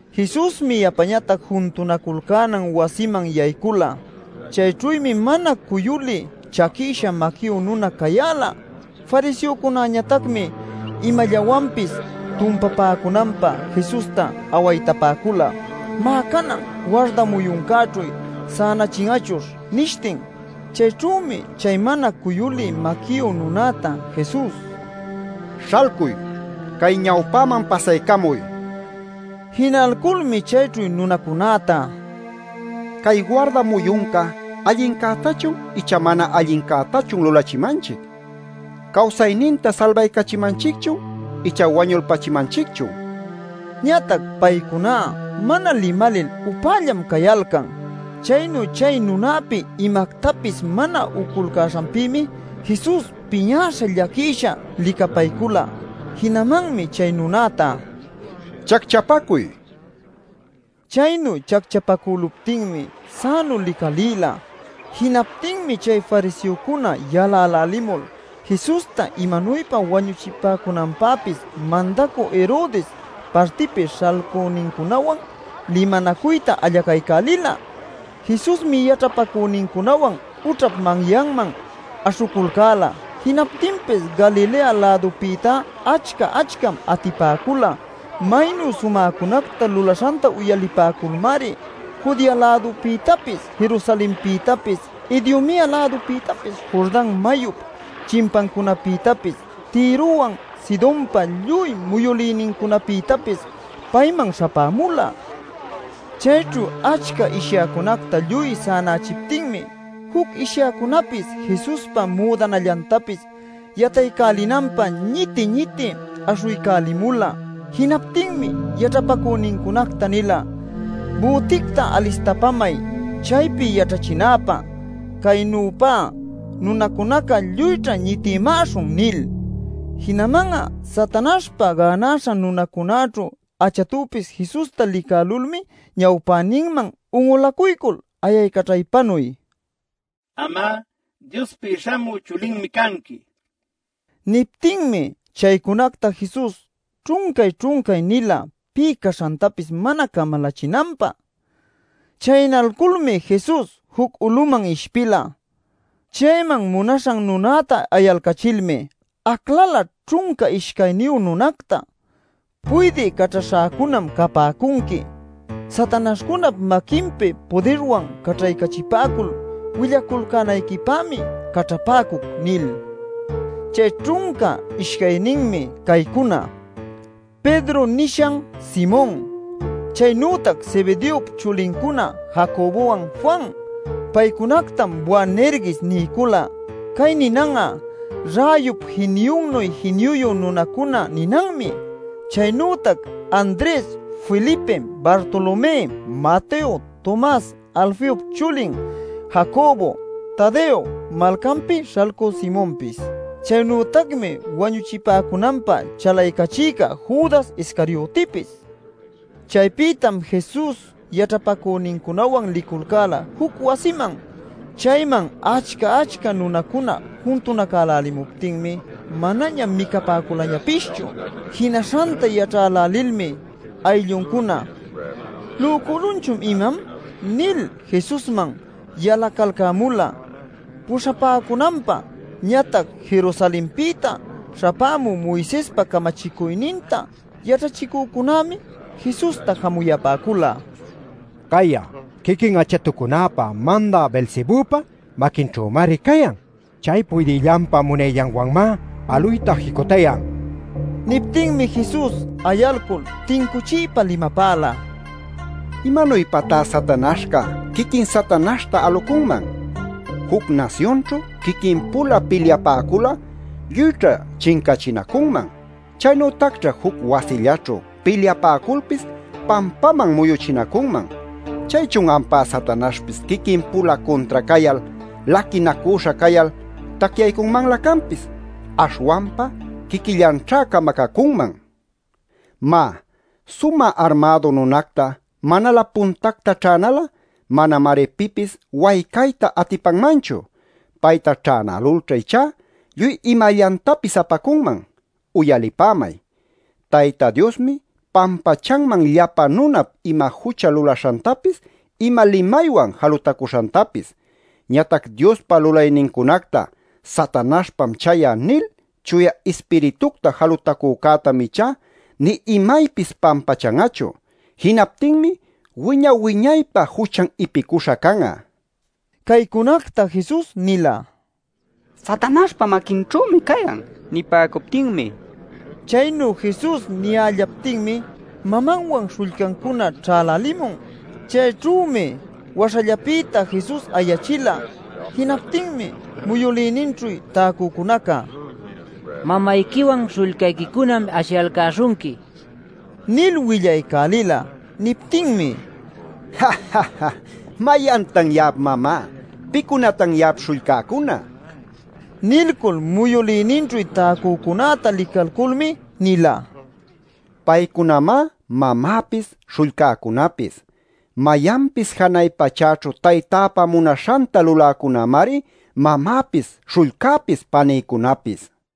Jesusmi yapañatac juntunaculcänan wasiman yaycula. Chayćhümi mana cuyulï chaquïsha maquiyu nuna cayäla. Fariseocunäñatacmi imallawanpis tumpapäcunanpä Jesusta awaytapäcula: “Má, canan warda muyuncäćhu sänachin'achuśh” nishtin. Chayćhümi chay mana cuyulï maquiyu nunäta Jesus: “¡Śhalcuy, cay ñawpäman pasaycamuy!” nil pasaycachila. Jinalculmi chayćhu nunacunäta: “¿Cay warda muyunca allincätachun icha mana allincätachun lulachimanchic? ¿Cawsayninta salbaycachimanchicchun icha wañulpachimanchicchun?” nin. Ñatac paycuná mana limalil upällallam cayalcan. Chaynu chay nunäpi imactapis mana uculcäśhanpïmi Jesus piñäśha llaquïsha licapaycula. Jinamanmi chay nunäta: “Chacchapacuy” nila. Chaynu chacchapacüluptinmi sänu licalïla. Jinaptinmi chay fariseocuna yalälälimul, Jesusta imanuypa wañuchipäcunanpäpis mandacü Herodes partipi śhalcünincunawan limanacuyta allaycaycälila. Jesusmi yaćhapacünincunawan ućhap manyanman aśhuculcäla. Jinaptinpis Galilea-lädupïta achca-achcam atipäcula. Maynu sumäcunacta lulaśhanta uyalipäculmari Judea-lädupïtapis, Jerusalenpïtapis, Idumea-lädupïtapis, Jordan mayup chimpancunapïtapis, Tirowan Sidonpa lluy muyülïnincunapïtapis payman śhapämula. Chayćhu achca ishyäcunacta lluy sänachiptinmi, juc ishyäcunapis Jesuspa müdanallantapis yataycälinanpä ñiti-ñiti aśhuycälimula. Jinaptinmi yaćhapacünincunacta nila: “Büticta alistapamay chaypi yaćhachinäpä. Caynüpa nunacunacá lluyćha ñitïmäśhun” nil. Jinaman'a Satanaśhpa gänaśha nunacunäćhu achatupis Jesusta licälulmi ñawpäninman un'ulacuycul ayaycaćhaypanuy: “Am'a Diospi śhamü Chulinmi canqui” nil nipäcula. Niptinmi chaycunacta Jesus ćhuncay-ćhuncay nila pï caśhantapis mana camalachinanpä. Chaynalculmi Jesus juc uluman ishpila. Chayman munaśhan nunäta ayalcachilmi aclala ćhunca ishcayniyu nunacta: “Puydï caćhaśhäcunam capäcunqui. Satanaśhcunap maquinpi pudirwan caćhaycachipäcul willaculcänayquipämi caćhapäcuc” nil. Chay ćhunca ishcayninmi caycuna: “Pedro” nishan Simon. Chaynütac Zebedeop chulincuna Jacobowan, Juan. Paycunactam Boanerges niycula. (Cay ninan'a “Räyup jiniyunnuy jiniyuyu nunacuna” ninanmi.) Chaynütac Andres, Felipe, Bartolomé, Mateo, Tomas, Alfeop chulin Jacobo, Tadeo, malcanpi śhalcü Simonpis. Chaynütacmi wañuchipäcunanpä chalaycachïca Judas Iscariotipis. Chaypïtam Jesus yaćhapacünincunawan liculcäla juc wasiman. Chayman achca-achca nunacuna juntunacälälimuptinmi manaña micapäculañapischu. Jinaśhanta yaćhälälilmi aylluncuna “¿Lücülunchun imam?” nil Jesusman yalacalcämula puśhapäcunanpä. Ñatac Jerusalenpïta ćhäpämü Moisespa camachicuyninta yaćhachicücunämi Jesusta jamuyapäcula: “¡Cay'a quiquin achatucunap mandä Beelzebüpa maquinćhümari cayan! ¡Chay puydïllanpa munayllanwanmá aluyta jicutayan!” nil. Niptinmi Jesus ayalcul tincuchiypa limapäla: “¡¿Imanuypatá Satanaśhca quiquin Satanaśhta alucunman?! Juc nasyunćhu quiquin-pula pilyapäcul'a lluyćha chincachinacunman. Chaynütacćha juc wasillaćhu pilyapäculpis pampaman muyuchinacunman. ¿Chaychun ampá Satanaśhpis quiquin-pula cuntra cayal laquinacüśha cayal tacyaycunmanlä canpis? Aśhwanpa quiquillanćhá camacacunman. Má, sumä armädu nunacta manalä puntacta ćhänal'a manamari pipis waycayta atipanmanchu. Payta ćhänälulćha ichá lluy imallantapis apacunman. Uyalipämay: Tayta Diosmi pampachanman llapa nunap ima jucha lulaśhantapis ima limaywan jalutacuśhantapis. Ñatac Diospa lulaynincunacta ‘Satanaśhpam chay'a’ nil Chuya Ispiritucta jalutacücätam ichá nï imaypis pampachan'achu. Jinaptinmi wiñay-wiñaypä juchan ipicuśha can'a” nil. Caycunacta Jesus nila “Satanaśhpa maquinćhümi cayan” nipäcuptinmi. Chaynu Jesus niyällaptinmi mamanwan śhullcancuna ćhälälimun. Chayćhümi waśhallapïta Jesusta ayachila. Jinaptinmi muyülïninćhu täcücunaca: “Mamayquiwan śhullcayquicunam ashiyalcäśhunqui” nil willaycälila. Niptinmi: “¿Mayantan ya'ap mamá? ¿Pïcunatan ya'ap śhullcäcuna?” nila. Nilcul muyülïninćhu täcücunäta licalculmi nila: “Paycunamá mamäpis śhullcäcunapis. Mayanpis janay pachäćhu Taytäpa munaśhanta luläcunämari, mamäpis, śhullcäpis, panïcunäpis” nila.